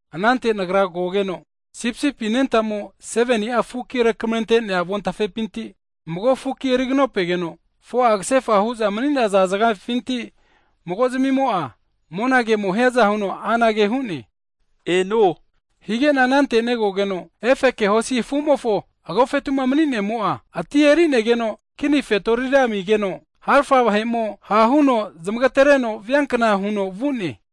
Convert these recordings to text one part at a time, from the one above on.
Anante nagra kogeno, Sipisipi anentamo 7ni'a fukinu rekamerente'nea avontafepinti, mago fuki eriganopegeno, 4'a kasefa hu'za mani'naza zagafinti mago'zmimo'a monage'mo'ma hiaza huno anage hu'ne, Eno! Hige'na anante negogeno, efeke hosi afu'mofo agofetu'ma mani'nemo'a, ati eri'negeno kini fetorira amigeno, harafa vahe'mo ha' huno zamagtereno viankna huno vu'ne.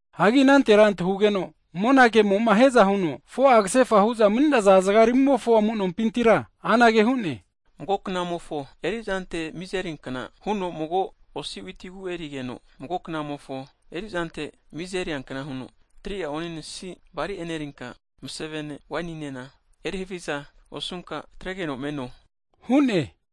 Hagi anantera antahugeno monagemo'ma hiaza huno 4'a kasefa hu'za mani'naza zagaramimofo amu'nompintira anage hu'ne, Mago knamofo erizante miza eriankna huno mago osi witi ku erigeno, mago knamofo erizante miza eriankna huno, 3'a onesisi bali enerinka, masavene waininena eri haviza osunka atregeno me'no hu'ne.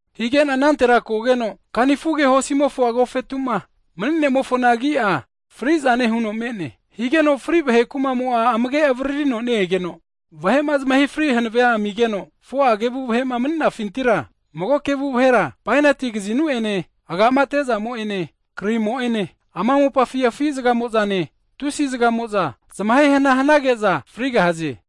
Hige'na anantera kogeno, kanifuge hosimofo agofetu'ma mani'nemofona agi'a, fri'zane huno me'ne. Higeno fri vahe kuma'mo'a amage avaririno ne-egeno, vahe'ma zamahe fri hanave amigeno, 4'a kevu vahe'ma mani'nafintira, mago kevu vahera bainati kazinu'ene, agama ate'zamo'ene, krimo'ene ama mopafi afi zagamo'zane, tusi zagamo'za zamahehana hanage'za frigahaze.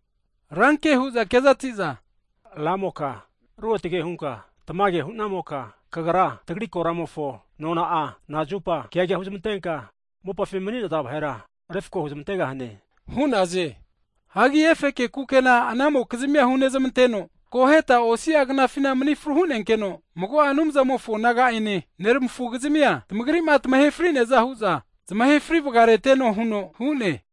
ranke hu'za kezati'za, Ramoka Ruotge hunka tamage nehamoka, Kagra tagri koramofo nona'a, nazupa keaga huzmantenka mopafima mani'naza vahera refko huzmantegahane? hu'naze. Hagi efeke kukena anamokizmia hunezmanteno, akoheta osia knafina mani fru hunenkeno, mago'a Anumzamofo naga'ene neramafugizmia, tamagri'ma tamahe fri'neaza hu'za zamahe fri vagareteno huno hu'ne.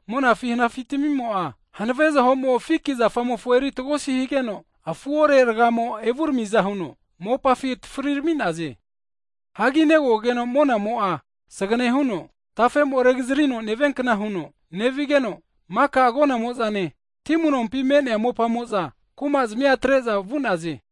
monafi hanafitamimo'a, hanave zahomo fiki zafamofo eritagosi higeno afuore ragamo tagiramiaza huno, mopafi atafri rami'naze. Hagi negogeno monamo'a sagane huno, harontafe regazarino neviankna huno nevigeno, maka agonamo'zane, ti amu'nompi me'nea mopamo'za kuma'zamia atre'za vu'naze.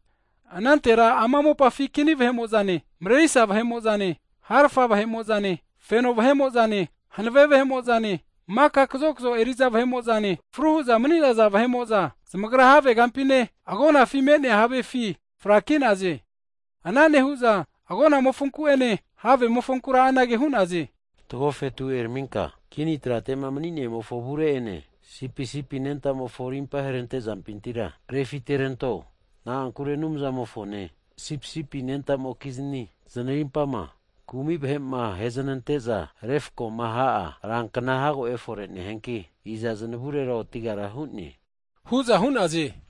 Anantera ama mopafi kini vahe'mo'zane, marerisa vahe'mo'zane, harafa vahe'mo'zane, feno vahe'mo'zane, hanave vahe'mo'zane, maka kazokzo eri'za vahe'mo'zane, fru hu'za mani'naza vahe'mo'za, zamagra havegampine, agonafi me'nea havefi fraki'naze. Ana nehu'za agonamofonku'ene havemofonkura anage hu'naze. Tagri tagofetu eraminka, kini trate'ma mani'nemofo avure'ene, Sipisipi anentamofo rimpa herante zampintira refiteranto. Na'ankure Anumzamofone, Sipisipi anentamoke zanarimpama kumi vahe'ma aheznante'za refkoma ha'a rankna hago efore nehianki, iza zanavurera otigara hu'ne? hu'za hu'naze.